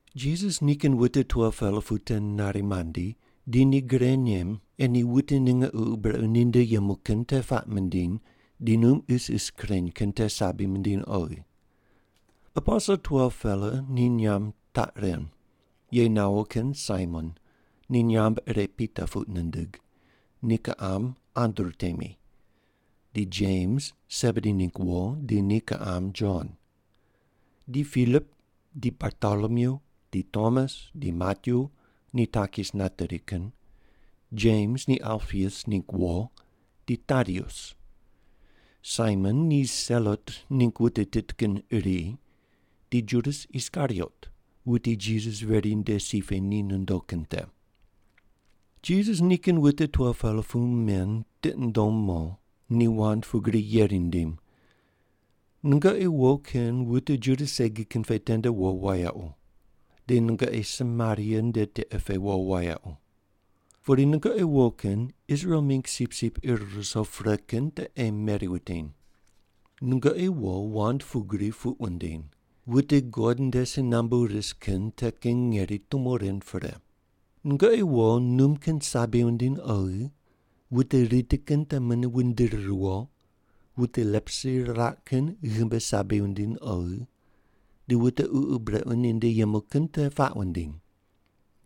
Jisas nikin wute 12-pela pu te nari mandi, di ni gre nem ei ni wute ninge ququ brequ ninde yemu kin te puaq mindiny di num isis kureny kin te sabi mindiny oghi. Aposel 12-pela ni nyamb taq ren: ye nawo kin Saimon ni nyamb ire Pita puq nindig, ni kiqam Andru temi; di Jems, Sebedi ningg wo, di ni kiqam Jon. Di Pilip, di Bartolomyu di Tomas di Matyu, ni takis nateri kin; Jems ni Alpius ningg wo, di Tadius. Saimon ni Selot ningg wute tit kin iri, di Judas Iskariot, wuti Jisas veri nde si pe ni nondo kin te. Jisas nikin wute 12-pela pu men tiqi nundom mo, ni wand pugri yeri nindim, “Nungoqi wo kin wute Juda segi kin pe tende wo wayequ. Di nungoqi Samaria nde tiqe pe wo wayequ. Pudi nungoqi wo kin Israel mingg sipsip ir ruso pre kin te ei meri wutiny. Nungoqi wo wand pugri puq wundiny, ‘Wute God nde si nambu ris kin te kin ngeri tumo rind pre.’ Nungoqi wo, num kin sabi wundiny oghi, wute riti kin te mune wundiri riwo, wute leprosi riraq kin ghimbi sabi wundiny oghi, di wute ququ brequ ninde yemu kin te puaq wundiny.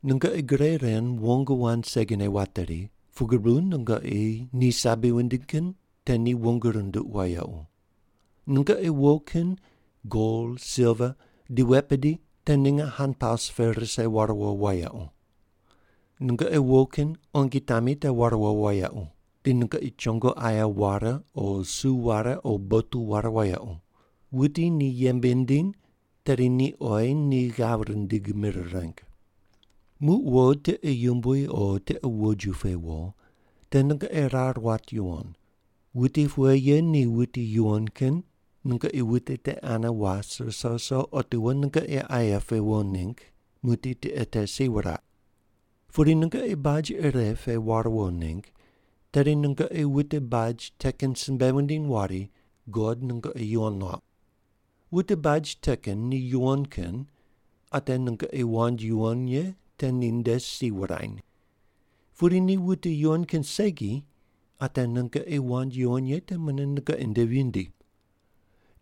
Nungoqi gre ren wong wand segine wateri, pugri bu nungoqi ni sabi wundiny kin te ni wong runduq wayequ. Nungoqi wo kin gol, silva, di wet bidi te ninge hanpaus pe rise ware wo wayequ. Nungoqi wo kin quongi tami te ware wo wayequ. Di nungoqi chongo aye ware o su ware o botu ware wayequ. Wuti ni yembe nindiny, tedi ni oyi ni ghav rindig mir reng. “Muq wo, tiqe yumbui o tiqe woju pe wo, te nungoqi rar wat yuwon, wuti pughe ye ni wuti yuwon kin, nungoqi wuti te ane was ruso ruso otiwo nungoqi aye pe wo ningg muqdi tiqe te si wuraq. Pudi nungoqi baj ire pe war wo ningg, tedi nungoqi wute baj te kin simbe wundiny wari, ‘God nungoqi yuwon nuauq.’ Wute baj te kin ni yuwon kin, ate nungoqi wand yuwon ye te ninde si wurany. Pudi ni wute yuwon kin segi, ate nungoqi wand yuwon ye te mune nungoqi nde vindi.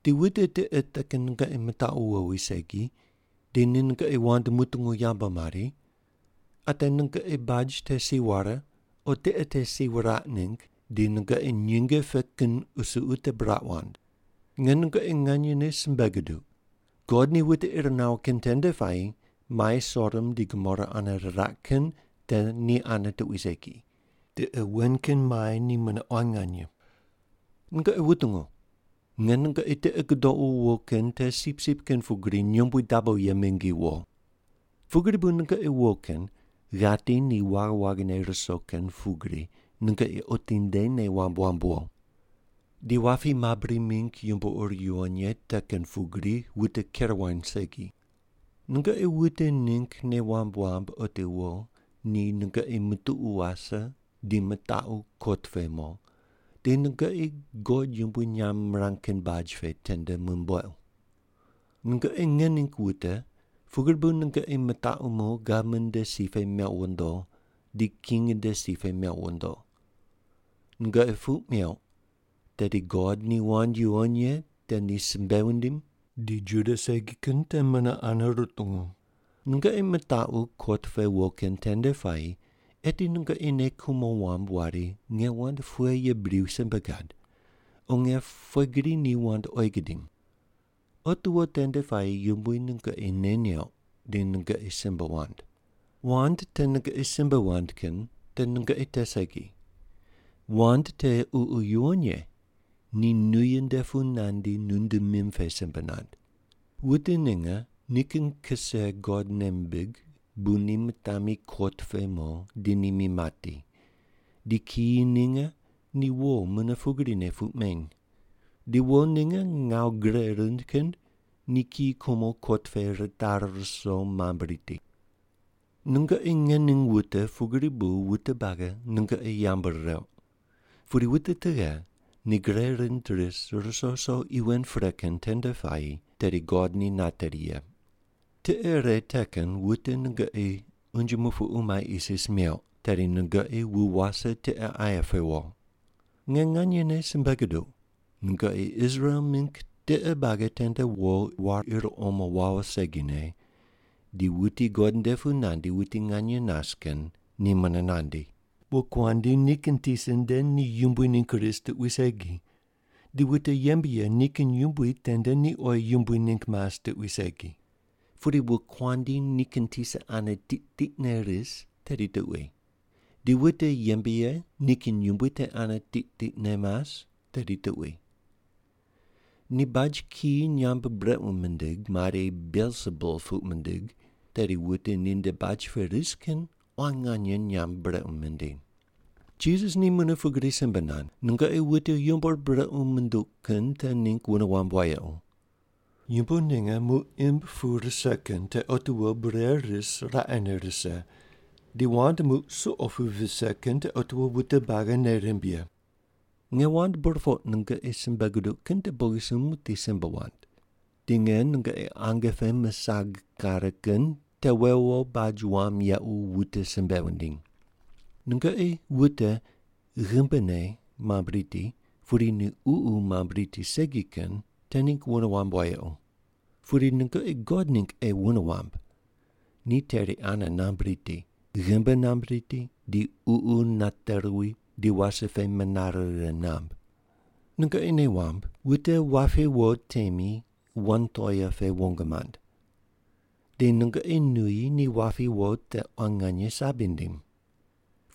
Di wute tiqe te kin nungoqi mitaqu wowi segi, di ni nungoqi wand mutungu yambu mari, ate nungoqi baj te si ware o tiqe te si wuraq ningg di nungoqi nyinge pe kin qusuqu te buraq wand. Nge nungoqi nganyene simbe guduq, God ni wute ir nawo kin tende puayi mai Sodom di Gomora ane riraq kin te ni ane tuqui segi, tiqe wen kin mai ni mune quan nganye.” “Nungoqi wutungu! Nge nungoqi tiqi gudoqu wo kin te sipsip kin pugri nyombui dabo ye mingi wo. Pugri bu nungoqi wo kin ghati ni waghi waghine ruso kin pugri nungoqi otinde nei wamb wamb wo. Di wapi mabri mingg yumbo ur yuwon ye te kin pugri wute ker wany segi. Nungoqi wute ningg nei wamb wamb otiwo ni nungoqi mutuqu wase di mitaqu kot pe mo, di nungoqi God yumbui nyamb mirang kin baj pe tende mumbuequ. Nungoqi nge ningg wute pugri bu nungoqi mitaqu mo gavman nde si pe mequ wondo di king nde si pe mequ wondo. Nungoqi puq meuq tedi God ni wand yuwon ye te ni simbe wundim di Juda segi kin te mune ane rutungu. Nungoqi mitaqu kot pe wo kin tende puayi eti nungoqi nei kumo wamb wari, ‘Nge wand pughe ye bri simbe gad, o nge pughe gri ni wand oyi gidim?’ Otiwo tende puayi Yumbui nungoqi nei neuq di nungoqi simbe wand. Wand te nungoqi simbe wand kin te nungoqi te segi. Wand te Ququ Yuwon Ye ni nuyi nde pu nandi nunde mim pe simbe nand. “Wute ninge nikin kise God nei mimbig bu ni mitami kot pe mo di ni mi mati, di kiyi ninge ni wo mune pugrine puq meny. Di wo ninge ngawu gre rind kin ni kiyi kumo kot pe ritari ruso mambui riti. Nungoqi nge ning wute pugri bu wute buagi nungoqi yambu rireuq. Pudi wute tughe ni gre rind ris ruso ruso qi wen pre kin tende puayi, tedi God ni nateri ye. Tiqe ire te kin wute nungoqi unje mupuqu mai isis meuq, tedi nungoqi wu wase tiqe aye pe wo. Nge nganyene simbe guduq, nungoqi Israel mingg tiqe buagi tende wo war ir omo wawo segine di wuti God nde pu nandi wuti nganye nas kin ni mune nandi. “Wokuandi nikin tisa nde ni yumbui ningg ris tuqui segi, di wute yembe ye nikin yumbui tende ni oyi yumbui ningg mas tuqui segi. Pudi wokuandi nikin tisa ane tiq tiqne ris tedi tuqui, di wute yembe ye nikin yumbui te ane tiq tiqne mas tedi tuqui. Ni baj kiyi nyamb brequ mindig, mari, ‘Belsebul’ puq mindig, tedi wute ninde baj pe ris kin quan nganye nyamb brequ mindiny.” Jisas ni mune pugri simbe nand, “Nungoqi wute yumbo ur brequ munduq kin te ningg wune wamb wayequ. Yumbo ninge muq imb pu rise kin te otiwo bure ris raqene rise, di wand muq suqo pu vise kin te otiwo wute buagi nei rimb ye. Nge wand burpoq nungoqi simbe guduq kin te bogisumb muqdi simbe wand. Di nge nungoqi ange pe misag kare kin te wewo wo baj wam yequ wute simbe wundiny. Nungoqi wute ghimbine mamb riti pudi ni ququ mamb riti segi kin te ningg wune wamb wayequ. Pudi nungoqi God ningg ei wune wamb, ni teri ane namb riti, ghimbi namb riti di ququ nate ruwi di wase pe menare righe namb. Nungoqi nei wamb, wute wapi wo temi wan toea pe wong mand. Di nungoqi nuyi ni wapi wo te quan nganye sabi nindim.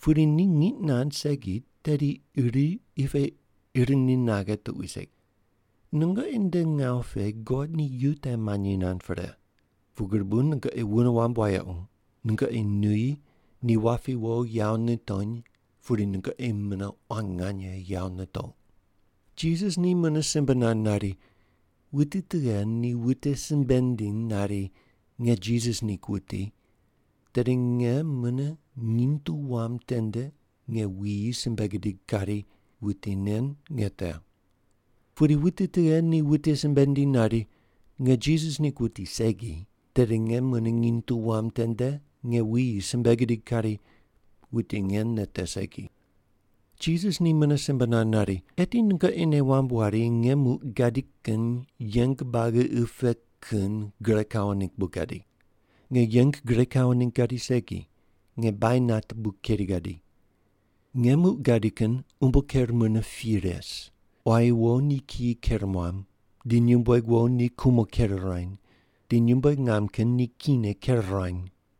Pudi ni ngiq nand segi, tedi iri qi pe ir ni naghe tuqui segi. Nungoqi nde ngawu pe God ni yu te manyi nand pre. Pugri bu nungoqi wune wamb wayequ, nungoqi nuyi ni wapi wo yawo nitony pudi nungoqi mune quan nganye yawo nitouq.” Jisas ni mune simbe nand nari, “Wuti tughe ni wute simbe nindiny nari, ‘Nge Jisas ningg wuti,’ tedi nge mune nginy tu wam tende nge wuyi simbe gidig kari, ‘Wuti nen nge te.’ Pudi wuti tughe ni wute simbe nindiny nari, ‘Nge Jisas ningg wuti segi,’ tedi nge mune nginy tu wam tende nge wuyi simbe gidig kari, ‘Wuti nen nge te segi’.” Jisas ni mune simbe nand nari, “Eti nungoqi nei wamb wari nge muq gadi kin yeng buagi qi pe kin gure kawo ningg bu gadi. Nge yeng gure kawo ningg gadi segi, nge bainat bu keri gadi. Nge muq gadi kin umbo ker mune pi res, ‘Quayi wo ni kiyi ker muam, di nyumbueg wo ni kumo ker ruany, di nyumbueg ngam kin ni kine ker ruany.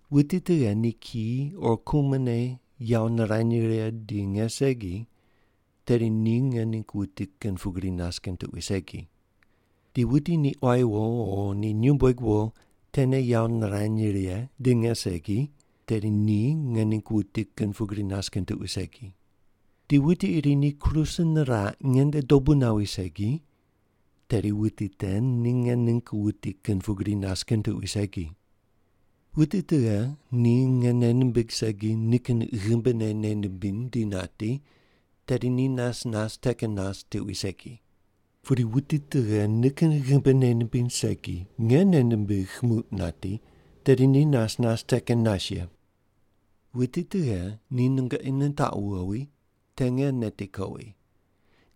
“Wuti tughe ni kiyi o kumone yawo nirany righe di nge segi, tedi ni nge ningg wuti kin pugri nas kin tuqui segi. Di wuti ni quayi wo o ni nyumbueg wo tene yawo nirany righe di nge segi, tedi ni nge ningg wuti kin pugri nas kin tuqui segi. Di wuti iri ni kruse niraq ngende dobu nawi segi, tedi wuti te ni nge ningg wuti kin pugri nas kin tuqui segi. Wuti tughe ni nge nei nimbigh segi nikin ghimbine nei nimbiny di nati, tedi ni nas nas te kin nas tuqui segi. Pudi wuti tughe nikin ghimbi nei nimbiny segi nge nei nimbigh muq nati, tedi ni nas nas te kin nas ye. “Wuti tughe ni nungoqi nitaqu wowi te nge neti kowi,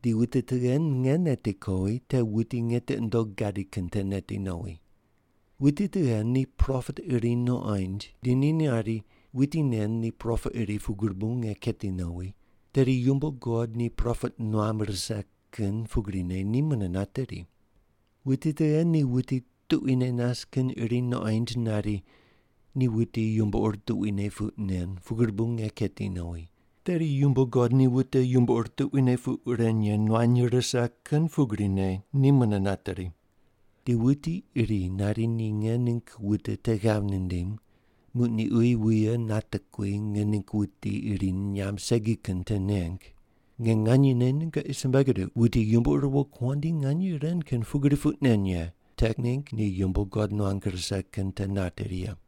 di wuti tughe nge neti kowi te wuti nge tiqi nundogh gadi kin te neti nowi. Wuti tughe ni propet iri nuqoind di ni nari, ‘Wuti nen ni propet iri pugri bu nge keti nowi,’ tedi yumbo God ni propet nuam rise kin pugrine ni mune nateri. Wuti tughe ni wuti tuquine nas kin iri nuqoind nari, ‘Ni wuti yumbo ur tuquine puq nen pugri bu nge keti nowi,’ tedi yumbo God ni wute yumbo ur tuquine puq ren ye nuany rise kin pugrine ni mune nateri. Di wuti iri nari ni nge ningg wute te ghav nindim muq ni uyi wuye natekui nge ningg wuti iri nyamb segi kin te neng, nge nganyene nungoqi simbe guduq, wuti yumbo ur wokuandi nganye ren kin puq nen ye te ningg ni yumbo God nuang rise kin te nateri ye.”